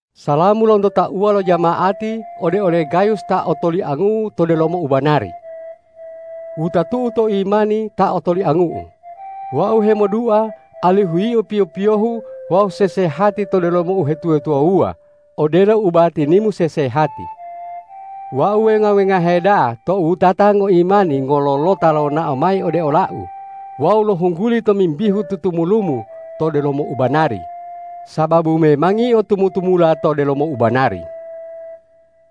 Salamu lonto tauwa lo jama'ati ode ole Gayus ta otoliangu'u to delomo ubanari. Wutatu'u to imani ta otoliangu'u, wau hemodua alihu yio piyo-piyohu wawu sesehati to delomo uhetuwa-tuwawuwa odelo ubatinimu sesehati. Wau wenga-wengahe da'a tou wutata ngoimani ngololota lonao mayi ode olau wawu lohungguli tomimbihu tutumulumu to delomo ubanari, sababu memangi yio tu- mu-tumula to delomo ubanari.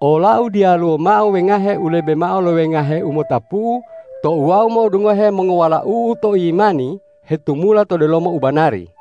Olau diyaluwo mao wengahe u lebe mao lo wengahe u motapu'u tou wau mo'odungohe mongowalau'u to imani hetumula to delomo ubanari.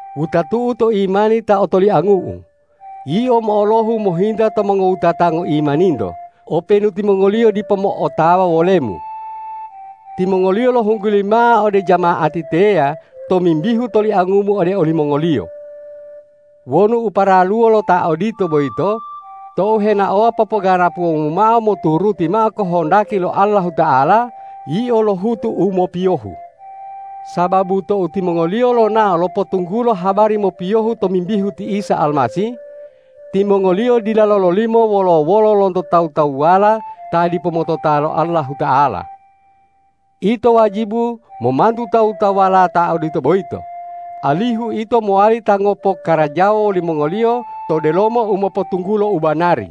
Wutatu'u to imani ta otoliangu'u, yio mo'olohu mohinta to mongowutata ngoimaninto, openu timongoliyo dipo mo'otawa wolemu. Timongoliyo lohungguli mao ode jama'ati teya tomimbihu toliangumu ode olimongoliyo. Wonu u paraluwo lo ta odito boyito tou henaowa popoganapuwomu mao moturuti mao kohondaki lo Allahuta'ala, yio lohutu u mopiyohu. Sababu tou timongoliyo lonao lopotunggulo habari mopiyohu tomimbihu ti Isa Almasih, timongoliyo dila lololimo wolo-wolo lonto tawu-tawuwala ta dipo motota lo Allahuta'ala. Ito wajibu momantu tawu-tawuwala ta odito boyito, alihu ito mowali ta ngopokarajawa wolimongoliyo to delomo u mopotunggulo u banari.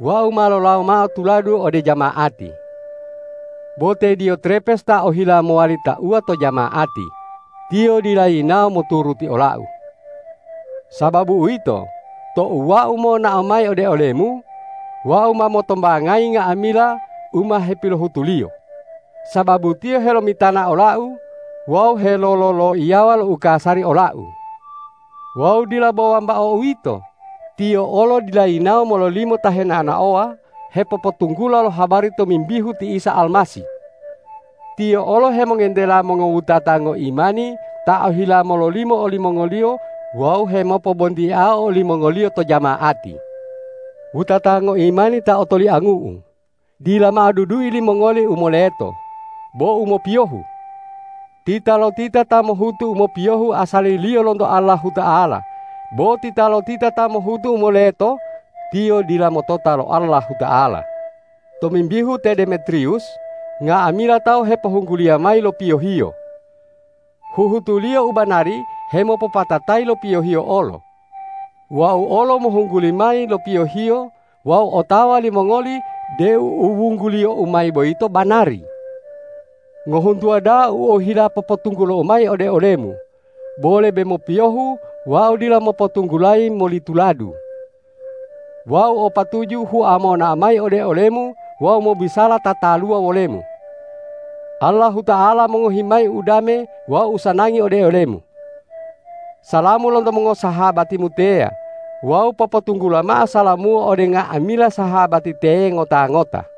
Wau ma lolawo mao tuladu ode jama'ati. Bo te Diyotrepes ta ohila mowali tauwa to jama'ati, tiyo dila yinawo moturuti olau. Sababu uwito, tou wau monao mayi ode olemu, wau ma motombangayi nga'amila u ma hepilohutuliyo, sababu tiyo helomitana olau wawu helolo-loiyawa lo ukasari olau. Wawu dila bo wambao uwito, tiyo olo dila yinawo mololimo ta henao-naowa hepopotunggula lo habari tomimbihu ti Isa Almasih. Tiyo olo hemongentela mongowutata ngoimani ta ohila mololimo olimongoliyo wawu hemopobontiao olimongoliyo to jama'ati. Wutata ngoimani ta otoliangu'u, dila mao dudui limongoli u moleto, bo u mopiyohu. Titalotita ta mohutu u mopiyohu asaliliyo lonto Allahuta'ala; bo titalotita ta mohutu u moleto, tiyo dila motota lo Allahuta'ala. Tomimbihu te Demetriwus, nga'amila tawu hepohungguliya mayi lo piyohiyo. Huhutuliyo u banari hemo- popatatayi lo piyohiyo olo. Wau olo mohungguli mayi lo piyohiyo wawu otawa limongoli deu u wungguliyou mayi boyito banari. Ngohuntuwa da'a u ohila popotunggulou mayi ode olemu, bo lebe mopiyohu wau dila mopotunggulayi moli tuladu. Wau o patuju hua monao mayi ode olemu wawu mobisala tataluwa wolemu. Allahuta'ala mongohi mayi udame wawu usanangi ode olemu! Salamu lonto mongosahabatimu teya wawu popotunggula mao salamu'u ode nga'amila sahabati teye ngota-ngota.